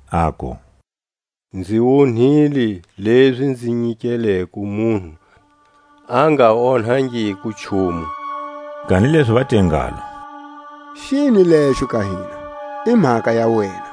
aku: Nzi onhile lezi nzinyikeleko munhu a nga onhangiko nchumu. Kanilezi va te ngalo: Xini lexo ka hina? I mhaka ya wena!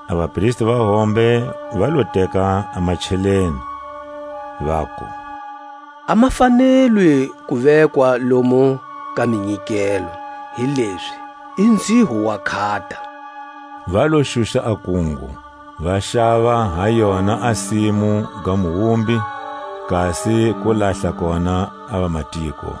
A vapristi va hombe va lo teka a macheleni, vaku: A ma fanelwi ku vekwa lomu ka minyikelo, hilezi i nzhiho wa nkhata. Va lo xuxa a kungo, va xava ha yona a simu ga muwumbi, kasi ku lahla kona a vamatiko.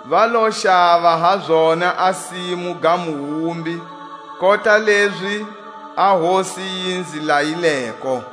Va lo xava ha zona a simu ga muwumbi, kota lezi a Hosi yi nzi layileko.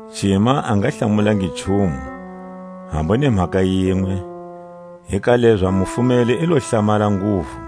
Cima a nga mu hlamulangi nchumu, hambu ni mhaka yinwe; hi ka lezo a mufumeli i lo hlamala nguvu.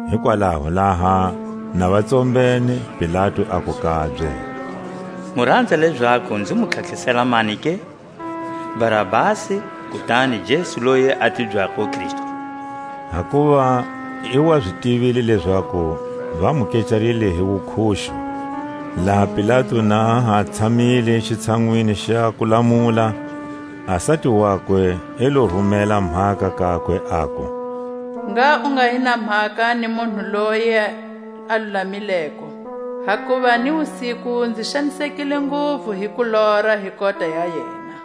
Hikwalaho laha na va tsombene, Pilatu aku kabye: Mu ranza lezaku nzi mu tlhatlhisela mani ke, Barabasi, kutani Jesu loyi a tibyako Kristu? Hakuva i wa zi tivile lezaku va mu kecarile hi wukhuxu. Laha Pilatu na ha tshamile xitshanwini xa kulamula, a sati wakwe i lo rumela mhaka kakwe, aku; Ngha u nga hi na mhaka ni munhu loye a lulamileko. Hakuva ni wusiku nzi xanisekile nguvu hi kulora hi kota ya yena.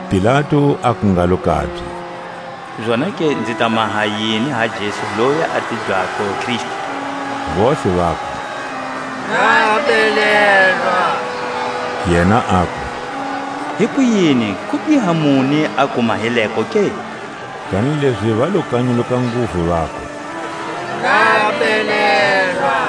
Pilatu aku ngalo kabye: Zonake nzi ta maha yini ha Jesu loyi a tibyako Kristu? Vontlhe vaku: Ngha a belelwa! Yena aku: Hikuyini, kubiha muni a ku mahileko ke? Kanilezi va lo kanyuluka nguvu, vaku: Ngha a belelwa!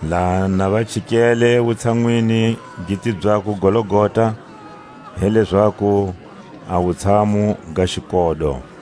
Laha na va chikele wutshanwini gi tibyako Golgota, hi lezaku, a wutshamu ga xikodo,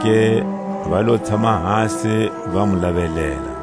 Zonake va lo tshama hasi va mu lavelela.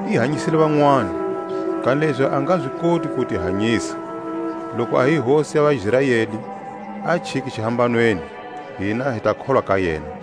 I hanyisile vanwani, kanilezi a nga zi koti ku ti hanyisa! Loku a hi hosi ya vaIsraeli, a chike xihambanweni, hina hi ta kholwa ka yena.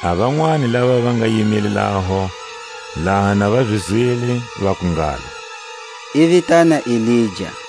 A vanwani lava va nga yimile laho, laha na va zi zwile, vaku ngalo: I vitana Elija.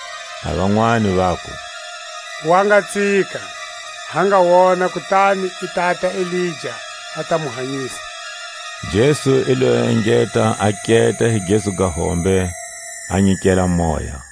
A vanwani vaku: Wa nga tsika; ha nga wona kutani i tata Elija a ta mu hanyisa. Jesu i lo engeta a keta hi gezu ga hombe, a nyikela moya.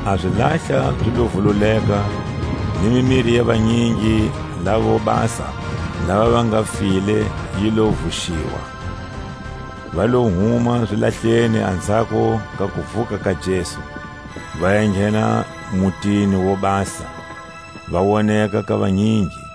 A zilahla zi lo vululeka, ni mimiri ya vanyingi laʼvo basa lava va nga file yi lo vuxiwa. Va lo huma zilahleni anzhako ka kuvuka ka Jesu, va enghena mutini wo basa, va woneka ka vanyingi.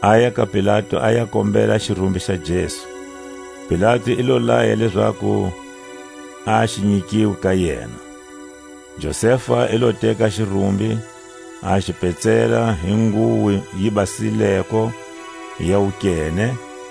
Aya ka Pilatu a ya kombela xirumbi xa Jesu; Pilatu i lo laya lezaku a xi nyikiwe ka yena. Josefa i lo teka a xirumbi, a xi petsela hi nguwo yi basileko ya wukene.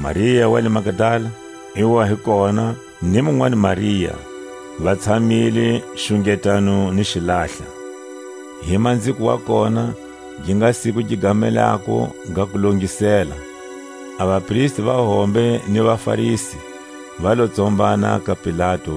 Maria wa le Magdala i wa hi kona, ni munwani Maria, va tshamile xungetano ni xilahla. Hi manziko wa kona, gi nga siku gi gamelako ga Kulongisela, a vapristi va hombe ni vaFarisi va lo tsombana ka Pilatu,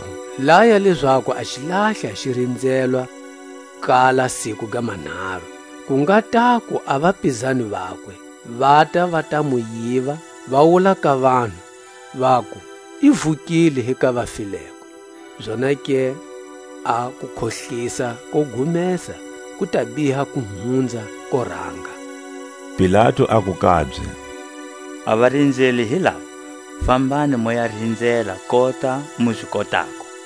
Hikwalaho laya lezaku a xilahla xi rinzelwa ku kala siku ga manharu, ku nga taku a vapizani vakwe vata va ta mu yiva, va wula ka vanhu, vaku: I vukile hi ka vafileko; zonake a kukhohlisa ko gumesa ku ta biha ku hunza ko ranga. Pilatu aku kabye: A varinzeli hi lava, fambani mu ya rinzela kota mu zi kotako.